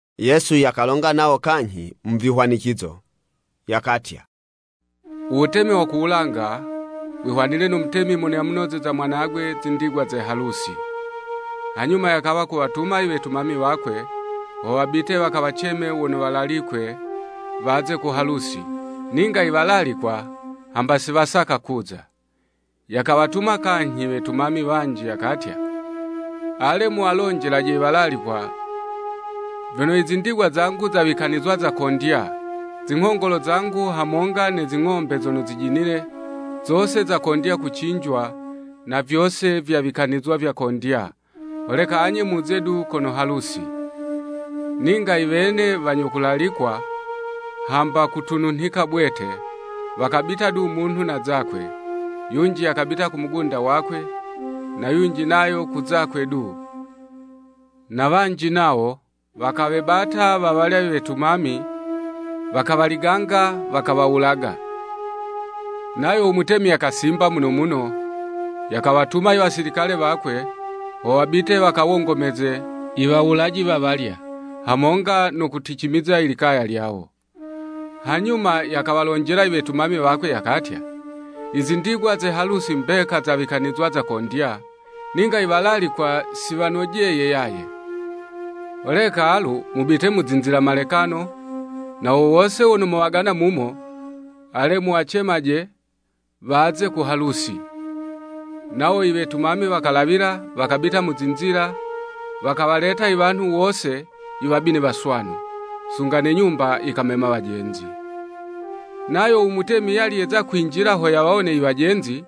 Yesu yakalonga nawo kanyhi mu vihwanicizo, yakatya, “Uwutemi wa ku wulanga wihwanile no mutemi mono yamunozeza u mwanagwe, zindigwa ze halusi. Hanyuma yakawa kuwatuma i wetumami wakwe ho wabite wakawaceme wono walalikwe, waze ku halusi, ninga iwalalikwa hamba si wasaka kuza. Yakawatuma kanyhi wetumami wanji, yakatya, ‘Ale, muwalonjelaje i walalikwa vyono, i zindigwa zangu zawikanizwa zakondya, zinghongolo zangu hamonga ne zing'ombe zono zijinile, zose zakondya kucinjwa na vyose vyawikanizwa vyakondya, holeka anye muze du kono halusi.’ Ninga iwene wanyo kulalikwa, hamba kutununhika bwete, wakabita du munhu na zakwe, yunji yakabita ku mugunda wakwe, na yunji nayo ku zakwe du, ne wanji nawo, wakawebata wawalya wetumami, wakawaliganga, wakawawulaga. Nayo u Mutemi yakasimba muno muno, yakawatuma i wasilikale wakwe, ho wabite wakawongomeze i wawulaji wawalya, hamonga no kuliticimiza i likaya lyawo. Hanyuma yakawalonjela iwetumami wakwe yakatya, ‘Izindigwa ze halusi mbeka zawikanizwa zakondya, ninga iwalalikwa si wanojeye yaye. Holeka alu mubite mu zinzila malekano, na wo wose wono mowagana mumo, ale muwacemaje waze ku halusi.’ Nawo iwetumami wakalawila, wakabita mu zinzila, wakawaleta iwanhu wose, iwabi ne waswanu. Sunga ne nyumba yikamema wajenzi. Nayo u mutemi yali yeza kwinjila ho yawawone iwajenzi,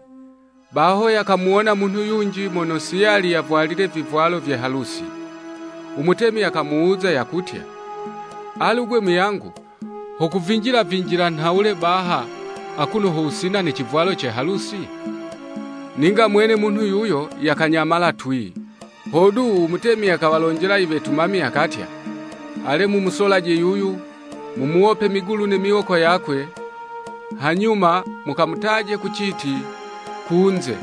baho yakamuwona munhu yunji mono si yali yavwalile ivivwalo vye halusi. U mutemi yakamuwuza yakutya, ‘Alu 'gwe muyangu, ho kuvinjila-vinjila nhawule baha, akuno ho wusina ne civwalo ce halusi?’ Ninga mwene munhu yuyo yakanyamala twii. Hodu, u mutemi yakawalonjela iwetumami yakatya, ‘Ale mumusolaje yuyu, mumuwope migulu ne miwoko yakwe, hanyuma mukamutaje ku citi, kunze,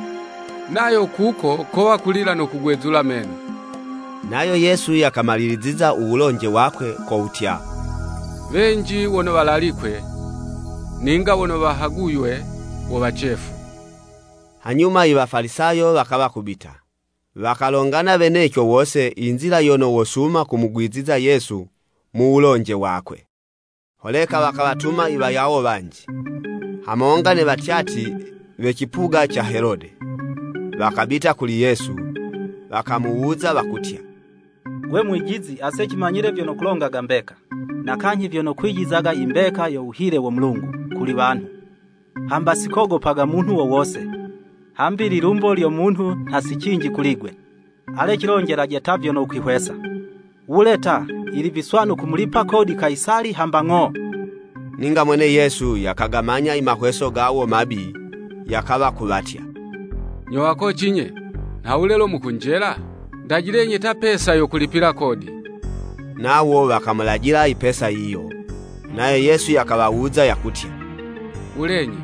nayo kuko kowa kulila no kugwezula meno.’” Nayo Yesu yakamaliliziza u wulonje wakwe, ko wutya, “Wenji wono walalikwe, ninga wono wahaguywe wo wacefu.” Hanyuma i Wafalisayo wakawa kubita, wakalongana weneco wose i nzila yono wosuma kumugwiziza Yesu mu wulonje wakwe. Holeka wakawatuma i wayawo wanji, hamonga ne watyatyi we cipuga ca Helode. Wakabita kuli Yesu, wakamuwuza wakutya, “Gwe Mwijizi, ase cimanyile vyono kulongaga mbeka, na kanyhi vyono kwijizaga i mbeka yo wuhile wo Mulungu kuli wanhu, hamba sikogopaga munhu wo wose, hambi ililumbo lyo munhu nha si cinji kuli'gwe. Ale cilonjelaje ta vyono wukwihwesa. Wule ta, yili viswanu kumulipa kodi Kayisali hamba ng'o?” Ninga mwene Yesu yakagamanya i mahweso gawo mabi, yakawa kuwatya, “Nyo wakoci'nye, nhawule lo mukunjela? Ndajilenyi ta pesa yo kulipila kodi.” Nawo wakamulajila i pesa yiyo. Nayo Yesu yakawawuza yakutya, “Wulenyi,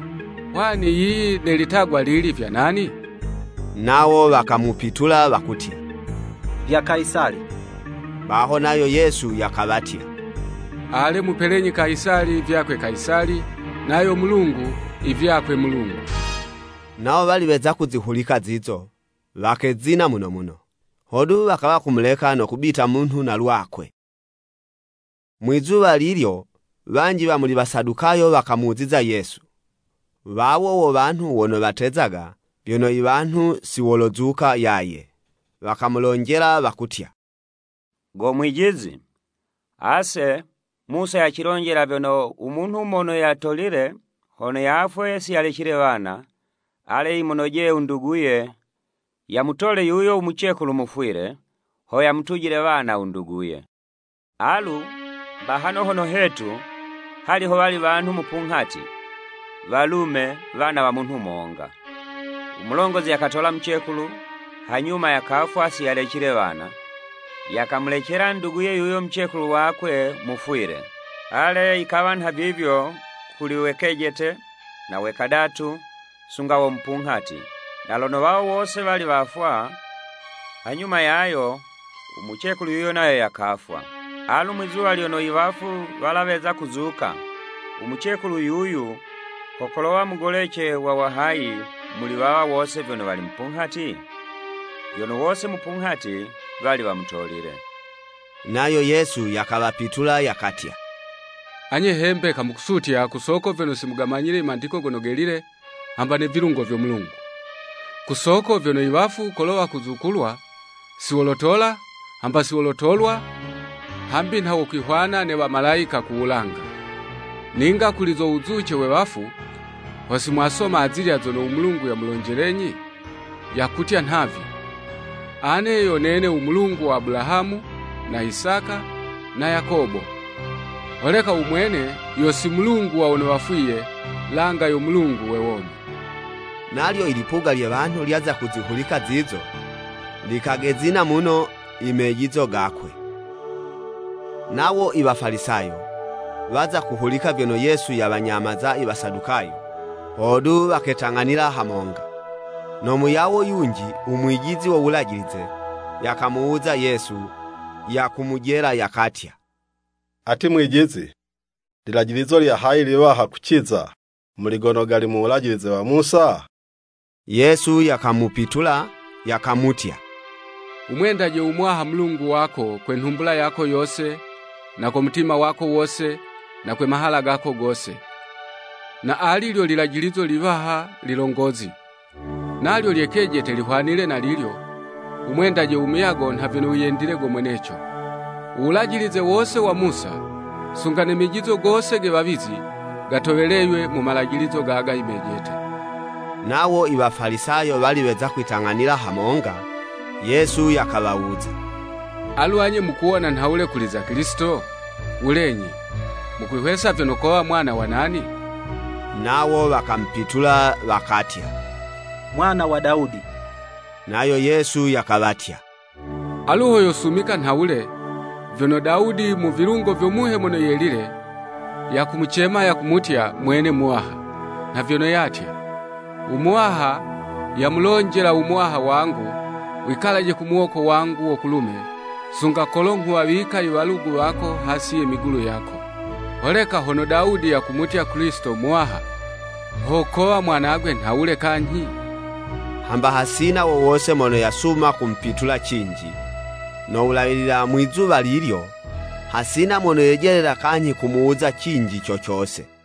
hwani yiyi ne litagwa lili, vya nani?” Nawo wakamupitula wakutya, “Vya Kayisali.” Baho nayo Yesu yakawatya, “Ale mupelenyi Kayisali vyakwe Kayisali, nayo Mulungu, ivyakwe Mulungu.” Nawo wali weza kuzihulika zizo, wakezina muno muno, hodu wakawa kumuleka no kwibitila munhu na lwakwe. Mwizuwa lilyo wanji wa muli Wasadukayo wakamuziza Yesu. Wawo wo wanhu wono watezaga vyono i wanhu si wolozuka yaye. Wakamulonjela wakutya, “Go Mwijizi, ase Musa yacilonjela vyono u munhu mono yatolile hono yafwe si yalecile wana, ale yimunojeye u nduguye, yamutole yuyo u mucekulu mufwile, ho yamutujile wana u nduguye. Alu, bahano hono hetu, hali howali wanhu mupunghati, walume, wana wa munhu monga. U mulongozi yakatola mucekulu, hanyuma yakafwa si yalecile wana, yakamulecela nduguye yuyo mucekulu wakwe, mufwile. Ale yikawa nha vivyo kuli we kejete, na we kadatu, sunga wo mupunghati. Na lono wawo wose wali wafwa, hanyuma yayo u mucekulu yuyo nayo yakafwa. Alu mwizuwa lyono i wafu wala weza kuzuka, u mucekulu yuyu, ho kolowa mugolece wa wahayi, muli wawa wose vyono wali mupunghati? Vyono wose mupunghati wali wamutolile.” Nayo Yesu yakawapitula yakatya, “Anye he mbeka mukusutya ku soko vyono si mugamanyile i Mandiko Gono Gelile, hamba ne vilungo vyo Mulungu!” Ku soko vyono i wafu kolo wakuzukulwa, si wolotola, hamba si wolotolwa, hambi nha wokwihwana ne wamalayika ku wulanga. Ninga kuli zo wuzuce we wafu, ho simwasoma azilya zono u Mulungu yamulonjelenyi? Yakutya nhavi, “Ane yo nene u Mulungu wa Abulahamu, na Isaka na Yakobo!” Holeka u Mwene yo si Mulungu wa wono wafwiye, langa yo Mulungu we womi. Nalyo ilipuga lye wanhu lyaza kuzihulika zizo, likagezina muno imejizo gakwe. Nawo i Wafalisayo, waza kuhulika vyono Yesu yawanyamaza i Wasadukayo, hodu waketang'anila hamonga. No muyawo yunji, u mwijizi wo Wulajilize, yakamuwuza Yesu, yakumujela, yakatya, “Ati Mwijizi, lilajilizo lya hayi liwaha kuciza, muli gono gali mu Wulajilize wa Musa?” Yesu yakamupitula yakamutya, “Wumwendaje u Muwaha Mulungu wako kwe nhumbula yako yose, na ko mutima wako wose, na kwe mahala gako gose. Na ali lyo lilajilizo liwaha ililongozi. Nalyo lye kejete lihwanile na lilyo, ‘Wumwendaje u muyago nha vyono wiyendile go mweneco!’ U Wulajilize wose wa Musa, sunga ne mejizo gose ge wawizi, gatoweleywe mu malajilizo gaga imejete.” Nawo i Wafalisayo wali weza kwitang'anila hamonga, Yesu yakawawuza, “Alu anye mukuwona nhawule kuli za Kilisito? Wulenyi, mukwihwesa vyono kowa mwana wa nani?” Nawo wakamupitula wakatya, “Mwana wa Dawudi.” Nayo Yesu yakawatya, “Alu ho yosumika nhawule, vyono Dawudi, mu vilungo vyo Muhe Mono Yelile, yakumucema yakumutya, mwene ‘Muwaha?’ Nha vyono yatya. [ ‘U Muwaha yamulonjela u Muwaha wangu wikalaje ku muwoko wangu wo kulume, sunga kolo nghuwawika i walugu wako hasi ye migulu yako.’] Holeka hono Dawudi yakumutya Kilisito, ‘Muwaha,’ ho kowa mwanagwe nhawule kanyhi?” Hamba hasina wo wose mono yasuma kumupitula cinji. No wulawilila mwizuwa lilyo, hasina mono yejelela kanyhi kumuwuza cinji co cose.